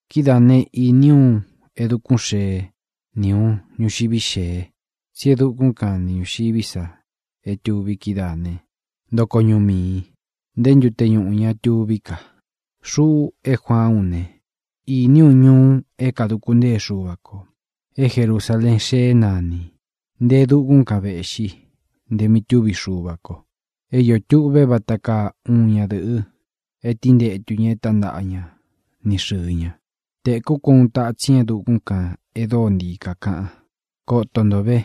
Kidáā né, īní u uun e dukún xēé ni ūun ñuxiví xēe. Tsí e dukún kan ni ñūxiví sa é tuvi kídaā ne, ntoko ñuꞌu miī. Nté ntute ñuꞌū ña tuví ka. Xuꞌu é Juaán u ne, īní u ñuu é kāduku ntée Xuva kō, é Jerusaleen Xeé nanī. Nte e dukún kan vēꞌxi, nte mí tuví Xuva kō. É iō tuꞌvé vata kaa uun ñadɨ̄ꞌɨ é tíntetu ña e tántaꞌa ña ni xɨ̄ɨ ña. Tēkú ko uun tatsin é dukún kān e dóo ntii kākaꞌan: —Koto nto ve,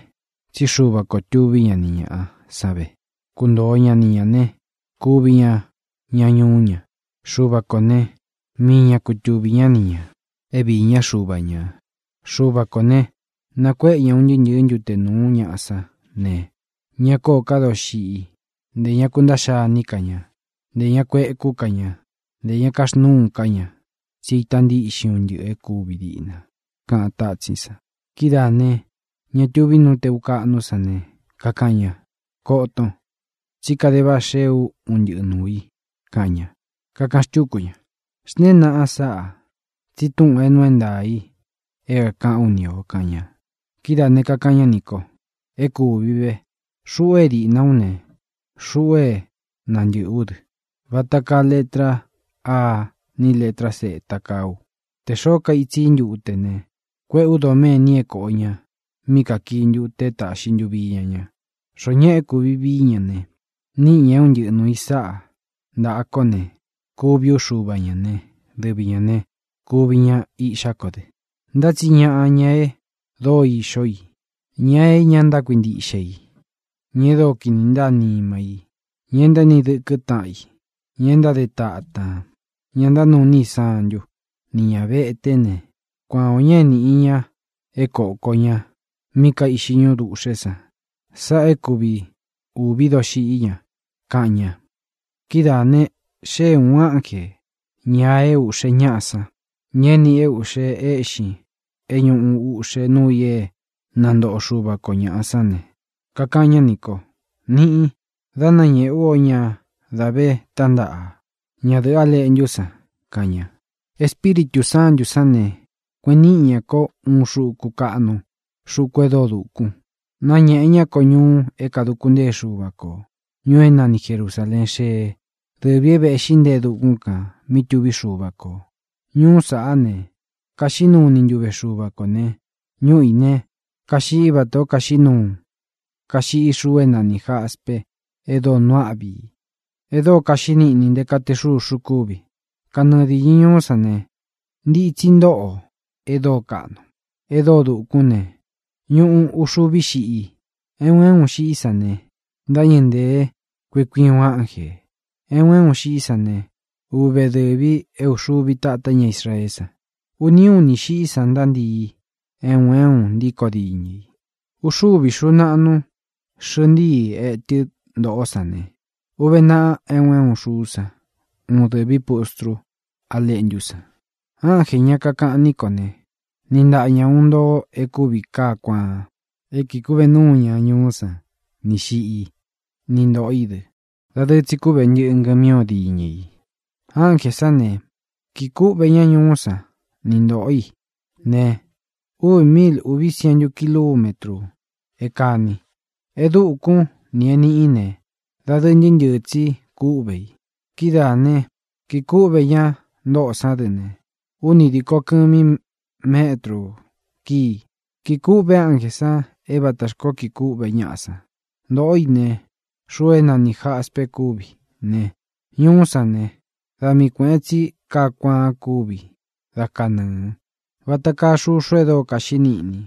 tsí Xuva ko tūví ña ni ñāꞌa san ve. Kuntoo ña ni ñā ne, kuvi ña ña ñuú ña. Xuva kō né, mii ña kutuvī ñá ni ñā, é viī ñá Xuva ñā. Xuva kō ne, nakuéꞌe ña un ntɨɨ́ ntɨ̄ɨ́ ntute nūú ñaꞌa sán ne, ña kóō ká doxiꞌi; ntē ña kuntaꞌxa iní ka ña; ntē ña kuekú ka ña; ntē ña kaxnúu ka ñā. Tsi é ita ntíꞌxin un ntɨꞌɨ̄ e kúvi diꞌna —kaꞌan tátsín san. Kidáā ne, ña tuví nú tēu kaꞌnú san ne, kakaꞌan ña: —Koton, tsí kade váꞌa xeé u un ntɨꞌɨ nuū i —kaꞌan ña. Kakaꞌan xtúku ña: —Xntēén naꞌan sáꞌā, tsi túꞌūn é nuu é ntaā í é kākaꞌán u ni ō —kaꞌan ña. Kidáā ne, kakaꞌan ñá nī ko: —É kūvi ve. Xuꞌu é diꞌna ú ne, xuꞌu é nantɨ̄ꞌɨ ú dɨ. Vata kaa letra Á ni lētra Z kaa u. Te xōó kaitsi í ntute ne, kuéꞌē ú doméni é kōꞌo ña mí kākii ntute é tāꞌxi ntuvi iña ña. Xoó ñaꞌa é kūvi vií ña ne, níꞌi ñā é un ntɨꞌɨ nuū i sáꞌa ntāꞌa kó ne, kuvi ú Xuva ñā né, dɨvi ñā ne, kuvi ña iꞌxá ko dɨ. Ntá tsi ñaꞌa, ña e dóo ixó i, ña é ña ntákuintiꞌxe i, ña e dóo kini ntáa nima í, ña e ntaéni dɨkɨ́ taꞌan i, ña e ntáde tatān, ña ntánuu iní i santu, nī ña veté ne, kuan ō ña é nīꞌi ña é kōko ña mí kaiꞌxi ñúꞌu dūꞌxé san. Sáꞌā é kui ūví doxiꞌí ña —kaꞌan ña. Kidáā ne, xée ūun ánjē, ña é ūꞌxe ñáꞌa san, ña é nīꞌi i é ūꞌxe éꞌxin é ñūꞌu uꞌxe nuu i é nantoꞌo Xuva kō ñaꞌa sán ne, kakaꞌan ñá nī ko: —Niꞌin, dá nanēꞌe ú o ña da vé tantaꞌa, ñadɨ̄ꞌɨ́ A Leꞌntú san —kaꞌan ña. Espíritū Sántū sán ne, kueꞌen níꞌi ñā kó uun xuku kaꞌnu, xuku e dóo dūkun. Náñēꞌe ñá ko ñuu é kāduku ntée Xuva kō, ñuu é nani Jerusāleen Xeé, dɨvī é vēꞌxí nte e dukún kān, mí tuví Xuva kō. Ñuú sāꞌá ne, kaxiꞌí nuu ni ntuve Xuva kō ne, ñúꞌu ī ne, kaiꞌxi vátā ó kaiꞌxi xuu é nanī jaspe e dóo nuu áꞌvi i, e dóo kaxiꞌí niꞌni e nté kaa te xūxu kúvi. Kanɨɨ dīñɨ ñuú san ne, ntitsi ntóꞌo e dóo kaꞌnu, e dóo dukún ne, ñuꞌu uxuví xiꞌi i. É un é un xiꞌí san ne, ntáñɨ̄ ntee kui kui uun ánjē. É un é un xiꞌí san ne, uve dɨ̄vi é uxuvi tátá ña Israeé san. Uni únī xiꞌí san ntántii é un é un ntíko diñɨ i. Uxúvi xūu naꞌnu xɨꞌɨ ntíi etɨ́ ntoꞌó san ne, uve naꞌa é un é un xuú san uun dɨ̄ví pustru Á Leꞌntú san. Ánjē, ña kakaꞌan ní ko ne, niꞌi ntaꞌa ña uun ntoo e kúvi kaá kuaan é kīꞌi kúꞌve núu ñá ñuú san ni xiꞌi i, ni ntoꞌō í dɨ. Dadɨɨ tsi kúꞌve ntɨꞌɨ̄ ngɨmí o diñɨ i. Ánjē sán ne, kīꞌi kúꞌvē ñá ñuú san ni ntoꞌō í ne, uvi míil ūví sientu kilumétru. É kāni, e dukún, nī e niꞌí ne, dadɨɨ ntɨɨ́ ntɨɨ̄ tsi kúꞌvē i. Kidáā né, kīꞌi kúꞌvē ña ntóꞌō sán dɨ ne, úni dīko kɨmi métru kíi. Kīꞌi kûꞌve ánjē san é vatā xkoó kiꞌi kûꞌvé ñaꞌa san. Ntōꞌó i ne, xuu é nanī jaspe kúvi ne, ñuú san ne, da mii kuēꞌen tsi kaá kuaan kúvi da kanɨɨ̄, vata kaa xuxu e dóo kaxiꞌí niꞌni.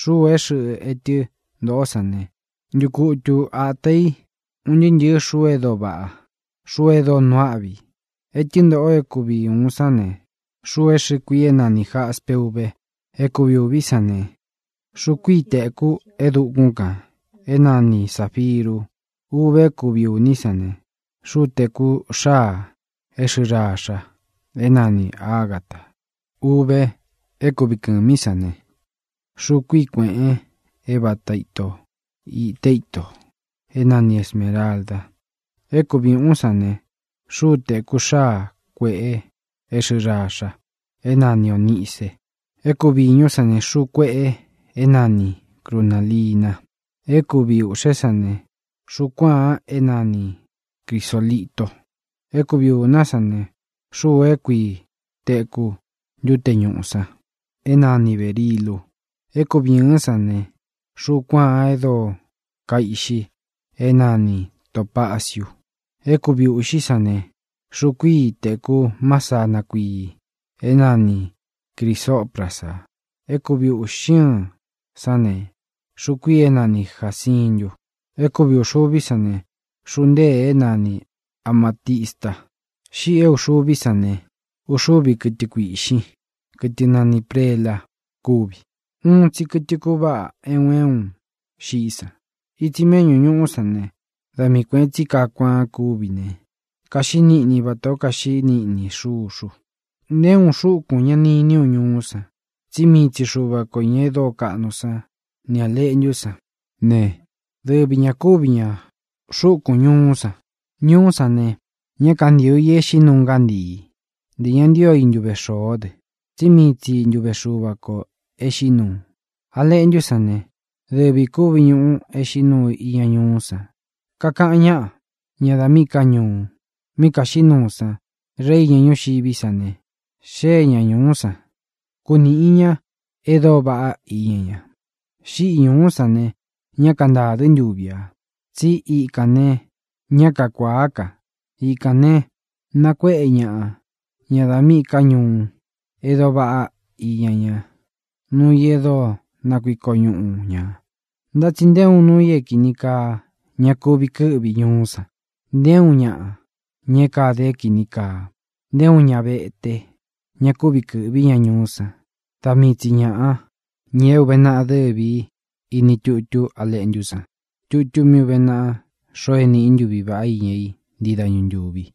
Xúū é xɨꞌɨ ntiī etɨ́ ntōꞌó san ne, ntukutu āta i un ntɨɨ́ ntɨ̄ɨ́ xuu e dóo vaꞌá, xuu e dóo nuu áꞌvi i. Ētɨ́ ntōꞌo é kuvi ūun sán ne, xuu é xɨ̄ꞌɨ kuii é nanī jaspe úve. É kuvi ūví san ne, xuu kuíi tēkú e dukún kān, é nani sāfiru, úve. É kuvi ūní san ne, xúu tēku xáā é xɨ̄ꞌɨ raxa, é nani āgata, úve. É kuvi kɨ̄mí san ne, xuu kuíi kuēꞌen é vata ito īte ítō, é nani esmēralda. É kuvi ūꞌún san ne, xúu tēku xáa kuēꞌe é xɨ̄ꞌɨ raxa, é nani ōnice. É kuvi īñú san ne, xuu kuéꞌe é nani crunālina. É kuvi ūꞌxé san ne, xuú kuāan é nani crisōlito. É kuvi ūná san ne, xuu kuíi tēku ntute ñúꞌu san, é nani bērilu. É kuvi ɨ̄ɨ́n san ne, xuú kuāan e dóo kaiꞌxi é nani tōpaciu. É kuvi ūꞌxí san ne, xuu kuíi tēku másana kuii, é nani crisōprasa. É kuvi ūꞌxi ɨ́ɨn sán ne, xuu kuíī é nani jācintu. É kuvi ūxuví san ne, xuu ntéē é nani amātista. Xíꞌī é ūxuví san ne, uxúvi kɨtɨ kuīꞌxin, kɨtɨ nani prela, kúvi. Uun tsi kɨtɨ kuváꞌa é un é un xiꞌí san. Itsi méꞌñū ñuú san ne, da mii kuēꞌen tsi kaá kuaan kúvi ne, kaxiꞌí niꞌni vatā ó kaxiꞌí niꞌni xuxu. Nté uun xúkūn ña ni iní u ñuú san, tsí mii Xuva kō, ña e dóo kaꞌnu sán, nī A Leꞌntú san ne, dɨvi ñā kúvi ña xúkūn ñuú san. Ñuú san ne, ñá kantīo i e xiꞌí nuu ngántií, ntē ña ntío i ntuve xōó dɨ, tsi míi tsi ntuve Xuva kō e xiꞌí nuu. A Leꞌntú san ne, dɨvi kūví ñuꞌu e xiꞌí nuu iña ñuú san. Kaka ñaꞌa, ña da míꞌī ká ñuu, mí kaxiꞌí nuu san. Rei iña ñúxiví san ne, xée ña ñūú san, kunīꞌi ña e dóo vaꞌá iña ña. Xíꞌi ñūú san ne, ñá kantādɨ́ ntuvi ā, tsí ikān ne, ñá kakuāá ka. Ikān ne, nakuéꞌe ñaꞌa, ña da míꞌī ká ñuu, e dóo vaꞌá iña ñá, nuu i e dóo nakuiko ñuꞌu ñā. Ntá tsi nté uun nuu i é kīni kaa ña kuvi kɨ́ꞌvi ñuú san. Nté uun ñaꞌa, ña é kāde é kīni kaa, nté uun ña vete ña kuvi kɨ́ꞌvi ña ñuú san. Da mii tsi ñāꞌa, ña é ūve naꞌa dɨ́vi ī iní tutú A Leꞌntú san, tutu mí ūve naꞌa xoo é nīꞌi i ntuví vaꞌá iña i ntii dañu ntúvi.